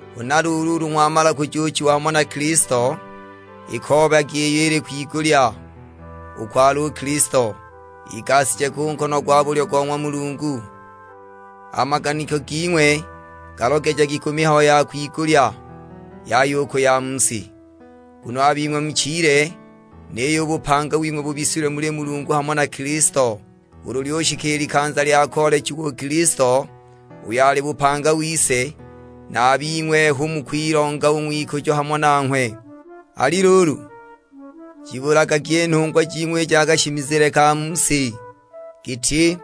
Huna luulu ulu ng'wamala kujuuchiwa hamo na Kilisto, ikoobagi iyo ili kwigulya, uko ali u Kilisto, igashije ku nkono gwa bulyo go ng'wa Mulungu. A maganiko ging'we galogejagi ku mihayo ya kwigulya, yaya u ku ya mu si. Nguno a bing'we muchile, niyo u bupanga wing'we bubisilwe muli Mulungu hamo na Kilisto. Ulu lyushika i likanza lya koolechiwa u Kilisto uyo ali bupanga wise, na a bing'we hu mukwilonga u ng'wikujo hamo nanghwe. Ali luulu, jibulagagi i nhungwa jing'we i ja kashimizile ka mu si, giti: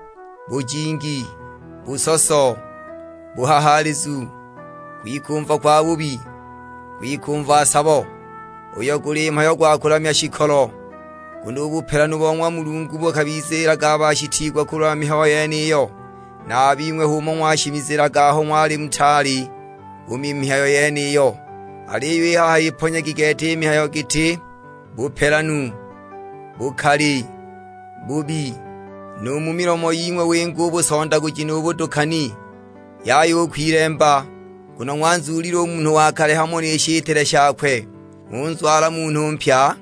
bujingi, busoso, buhahaalizu, kwikumva kwabubi, kwikumva sabo, (uyo guli mhayo gwa kulamya shikolo). Nguno u bupelanu bo ng'wa Mulungu bukabiziilaga a bashitiigwa kulwa mihayo yeniyo. Na a bing'we h'umo ng'washimizilaga aho ng'wali mutaali u mu mihayo yeniyo. Aliyo i haha iponyagi gete i mihayo giti: bupelanu, bukali, bubi; nu mu milomo ying'we winge u busondaguji nu budukani. Yaya u kwilemba, nguno ng'wanzuulile u munhu wa kale hamo ni shitile shakwe, ng'unzwala munhu mpya,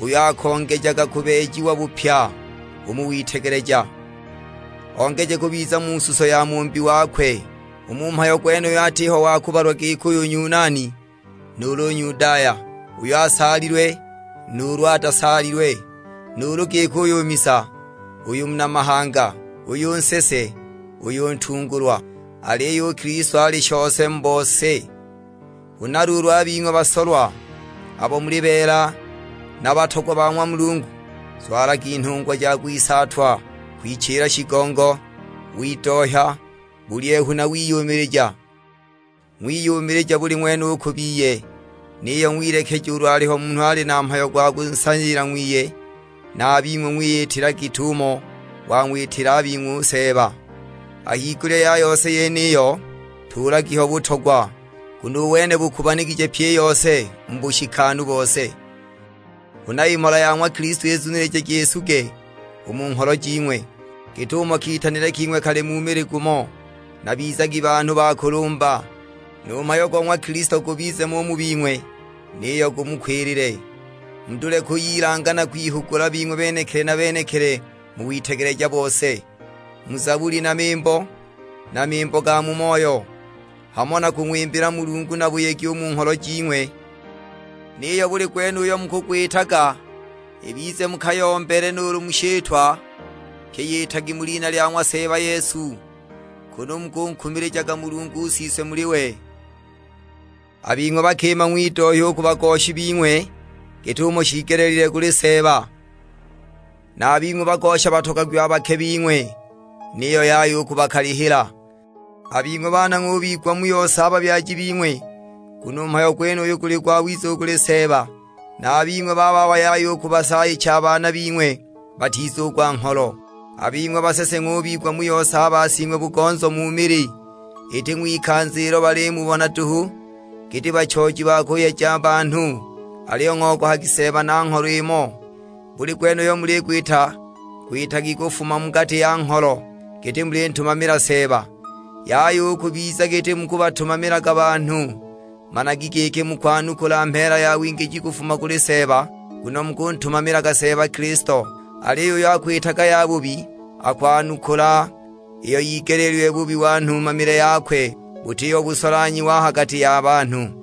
uyo akongejaga kubeejiwa bupya u mu witegeleja, ongeje kubiza mu suso ya Mumbi wakwe. U mu mhayo gwenuyu atiho wa kubalwa giki uyu Nyunani nuulu Nyudaya; uyu asaalilwe nuulu atasaalilwe, nuulu giki uyu misa, uyu muna mahanga, uyu nsese, uyu ntungulwa, aliyo u Kilisto ali shose mu bose. Huna luulu a bing'we basolwa, abo muli beela na batogwa ba ng'wa Mulungu, zwalagi nhungwa ja kwisaatwa, kwichila shigongo, widohya, bulyehu na wiyumilija. Ng'wiyumilija buli ng'wene u ku biye, niyo ng'wilekeja ulu aliho munhu ali na mhayo gwa kunsaayila ng'wiye, na a bing'we ng'wiyitila git'umo wang'witila a bing'we u Seeba. A higulya ya yose yeniyo tuulagi ho butogwa, nguno u wene bukubanigije pyi i yose mu bushikanu bose. Huna i mhola ya ng'wa Kilisto izunilijagi isuge u mu ngholo jing'we, git'umo kitanilwe king'we kali mu mili gumo; na bizagi banhu ba kulumba. Nu mhayo go ng'wa Kilisto gubize mo u mu bing'we, niyo gumukwilile. Mudule kuyilanga na kwihugula bing'we benekili na benekili mu witegeleja bose: mu Zabuli na mimbo, na mimbo ga mu moyo; hamo na kung'wimbila Mulungu na buyegi u mu ngholo jing'we. Niyo buli gwene uyo mukugwitaga, ibize mu kayombele nuulu mu shitwa; pye yitagi mu lina lya ng'wa Seeba Yesu, kunu mukunkumilijaga Mulungu Siswe muli we. A bing'we bakima ng'widohya u ku bagoshi bing'we git'umo shiigelile kuli Seeba. Na a bing'we bagosha batogagwi a bake bing'we, niyo yaya u kubakalihila. A bing'we baana ng'ubigwa mu yose a babyaji bing'we, nguno u mhayo gwenuyu guli gwawiza u kuli Seeba. Na a bing'we bababa yaya u kubasaayicha a baana bing'we batizugwa ngholo. A bing'we basese ng'ubigwa mu yose a basing'we-bugonzo mu mili, iti ng'wikanza ilo balimubona duhu, giti bachooji ba kuyeja banhu, aliyo ng'ogohagi Seeba na ngholo imo. Buli gwene uyo muligwita gwitagi kufuma mu gati ya ngholo, giti mulintumamila Seeba, yaya u kubiza giti mukubatumamilaga banhu. Managi giki mukwanukula mheela ya wingiji kufuma kuli Seeba, nguno mukuntumamilaga Seeba Kilisto. Aliyo uyo akwitaga yabubi, akwanukula iyo yigeleelilwe bubi wa nhumamile yakwe, butiho busolanhyiwa a ha gati ya banhu.